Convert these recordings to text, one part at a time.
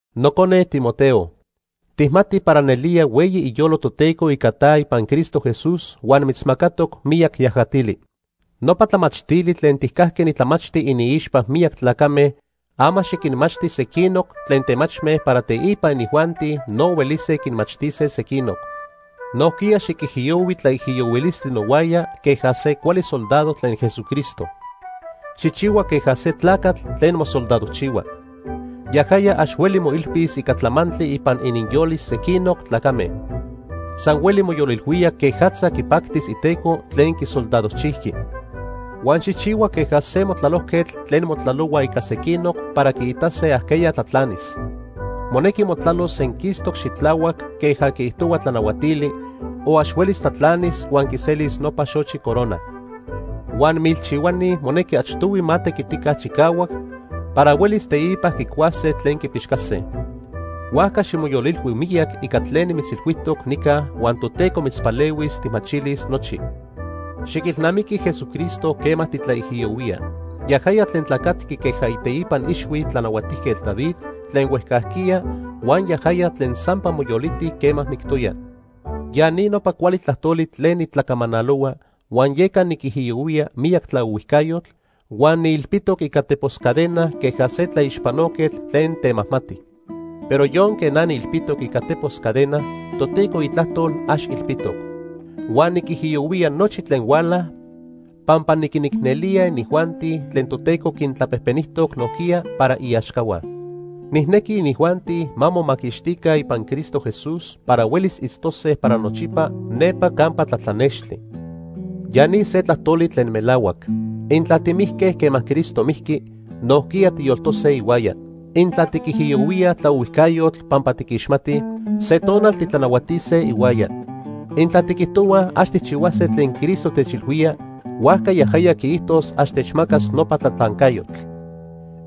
Nocone Timoteo, tijmati para nelía hueyi iyolo Toteco ica ta ipan Cristo Jesús huan mitzmacatoc miyac yajatili. Nopa tlamachtili tlen tijcajqui nitlamachti iniixpa miyac tlacame, ama xiquinmachti sequinoc tlen temachme para teipa inijuanti no huelise quinmachtise sequinoc. Nojquiya xiquijiyohui tlaijiyohuilistli nohuaya queja se cuali soldado tlen Jesucristo. Xijchihua queja se tlacatl tlen mosoldadojchihua. Yajaya ax hueli moilpis ica tlamantli ipan ininyolis sequinoc tlacame. San hueli moyolilhuía quejatza quipactis iteco tlen quisoldadojchijqui. Huan xijchihua queja se motlalojquetl tlen motlalohua ica sequinoc para quiitase ajqueya tlatlanis. Monequi motlalos senquistoc xitlahuac queja quiijtohua tlanahuatili o ax huelis tlatlanis huan quiselis nopa xochi corona. Huan milchihuani monequi achtohui ma tequitica chicahuac para huelis teipa quicuase tlen quipixcase. Huajca ximoyolilhui miyac ica tlen nimitzilhuijtoc nica huan Toteco mitzpalehuis tijmachilis nochi. Xiquilnamiqui Jesucristo quema titlaijiyohuía. Yajaya tlen tlacatqui queja iteipan ixhui Tlanahuatijquetl David tlen huejcajquiya huan yajaya tlen sampa moyoliti quema mictoya. Ya ni nopa cuali tlajtoli tlen nitlacamanalohua, huan yeca niquijiyohuía miyac tlaohuijcayotl huan niilpitoc ica tepos cadena queja se tlaixpanoquetl tlen temajmati. Pero yonque na niilpitoc ica tepos cadena, Toteco itlajtol ax ilpitoc. Huan niquijiyohuía nochi tlen huala pampa niquinicnelía inijuanti tlen Toteco quintlapejpenijtoc nojquiya para iaxcahua. Nijnequi inijuanti ma momaquixtica ipan Cristo Jesús para huelis itztose para nochipa nepa campa tlatlanextli. Ya ni se tlajtoli tlen melahuac: Intla timijque quema Cristo mijqui, nojquiya tiyoltose ihuaya. Intla tiquijiyohuíaj tlaohuijcayotl pampa tiquixmatij, se tonal titlanahuatise ihuaya. Intla tiquijtohuaj ax tijchihuase tlen Cristo techilhuía, huajca yajaya quiijtos ax techmacas nopa tlatlancayotl.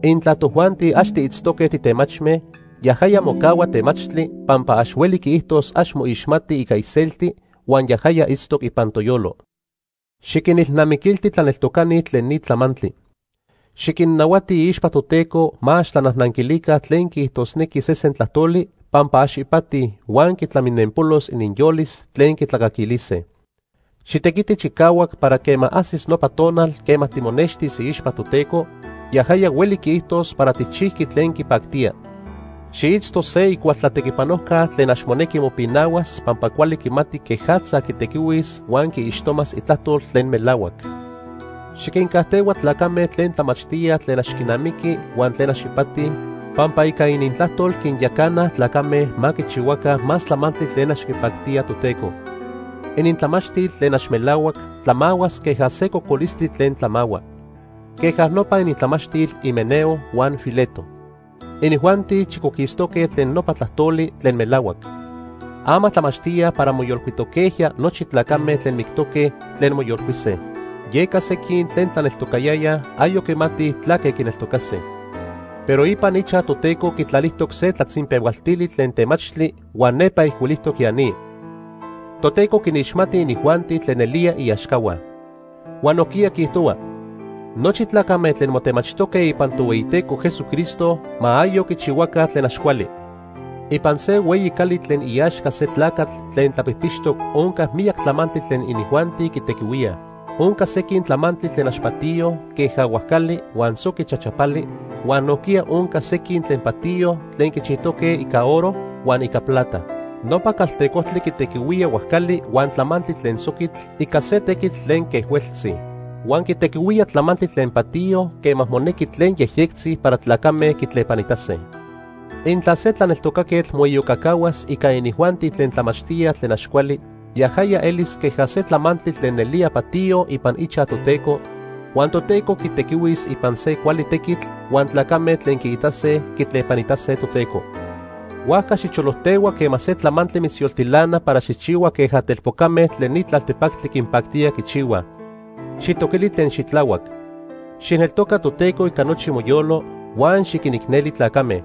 Intla tojuanti ax tiitztoque titemachme, yajaya mocahua temachtli pampa ax hueli quiijtos ax moixmati ica iselti huan yajaya itztoc ipan toyolo. Xiquinilnamiquilti tlaneltocani tlen ni tlamantli. Xiquinnahuati iixpa Toteco ma ax tlanajnanquilica tlen quiijtosnequi sesen tlajtoli, pampa ax ipati huan quitlaminenpolos ininyolis tlen quitlacaquilise. Xitequiti chicahuac para quema ajsis nopa tonal quema timonextis iixpa Toteco, yajaya hueli quiijtos para tijchijqui tlen quipactía. Xiitzto se icual tlatequipanojca tlen ax monequi mopinahuas pampa cuali quimati quejatza quitequihuis huan quiixtomas Itlajtol tlen melahuac. Xiquincajtehua tlacame tlen tlamachtíaj tlen ax quinamiqui huan tlen ax ipati, pampa ica inintlajtol quinyacanaj tlacame ma quichihuaca más tlamantli tlen ax quipactía Toteco. Inintlamachtil tlen ax melahuac tlamahuas queja se cocolistli tlen tlamahua. Queja nopa inintlamachtil Himeneo huan Fileto. Inijuanti chicoquistoque tlen nopa tlajtoli tlen melahuac. Ama tlamachtíaj para moyolcuitoquejya nochi tlacame tlen mictoque tlen moyolcuise. Yeca sequin tlen tlaneltocayayaj ayoc quimatij tlaque quineltocase. Pero ipan ichaj Toteco quitlalijtoc se tlatzinpehualtili tlen temachtli huan nepa ijcuilijtoc ya ni: “Toteco quinixmati inijuanti tlen nelía iaxcahua”; huan nojquiya quiijtohua: “Nochi tlacame tlen motemachijtoque ipan Tohueyiteco Jesucristo ma ayoc quichihuaca tlen ax cuali.” Ipan se hueyi cali tlen iaxca se tlacatl tlen tlapijpixtoc onca miyac tlamantli tlen inijuanti quitequihuíaj. Onca sequin tlamantli tlen ax patiyo queja huajcali huan soqui chachapali, huan nojquiya onca sequin tlen patiyo tlen quichijtoque ica oro huan ica plata. Nopa caltecojtli quitequihuía huajcali huan tlamantli tlen soquitl ica se tequitl tlen quejhueltzi. Huan quitequihuía tlamantli tlen patiyo quema monequi tlen yejyectzi para tlacame quitlepanitase. Intla se tlaneltocaquetl moiyocacahuas ica inijuanti tlen tlamachtíaj tlen ax cuali, yajaya elis queja se tlamantli tlen nelía patiyo ipan ichaj Toteco, huan Toteco quitequihuis ipan se cuali tequitl huan tlacame tlen quiitase, quitlepanitase Toteco. Huajca xicholojtehua quema se tlamantli mitzyoltilana para xijchihua queja telpocame tlen ni tlaltepactli quinpactía quichihuaj. Xijtoquili tlen xitlahuac. Xijneltoca Toteco ica nochi moyolo, huan xiquinicneli tlacame.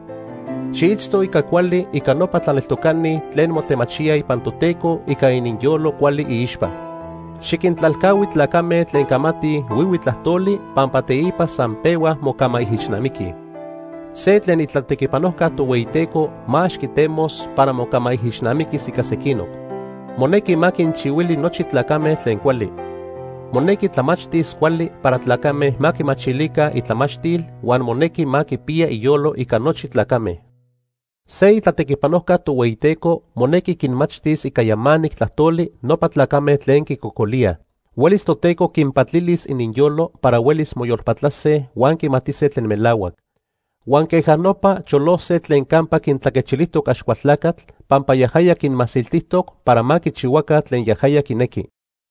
Xiitzto ica cuali ica nopa tlaneltocani tlen motemachíaj ipan Toteco ica ininyolo cuali iixpa. Xiquintlalcahui tlacame tlen camatij huihui tlajtoli pampa teipa san pehuaj mocamaijixnamiquij. Se tlen itlatequipanojca Tohueyiteco ma ax quitemos para mocamaijixnamiquis ica sequinoc. Monequi ma quinchihuili nochi tlacame tlen cuali. Monequi tlamachtis cuali para tlacame ma quimachilica itlamachtil huan monequi ma quipiya iyolo ica nochi tlacame. Se itlatequipanojca Tohueyiteco monequi quinmachtis ica yamanic tlajtoli nopa tlacame tlen quicocolíaj. Huelis Toteco quinpatilis ininyolo para huelis moyolpatlase huan quimatise tlen melahuac. Huan queja nopa, cholose tlen campa quintlaquechilijtoc Axcualtlacatl, pampa yajaya quinmasiltijtoc para ma quichihuaca tlen yajaya quinequi.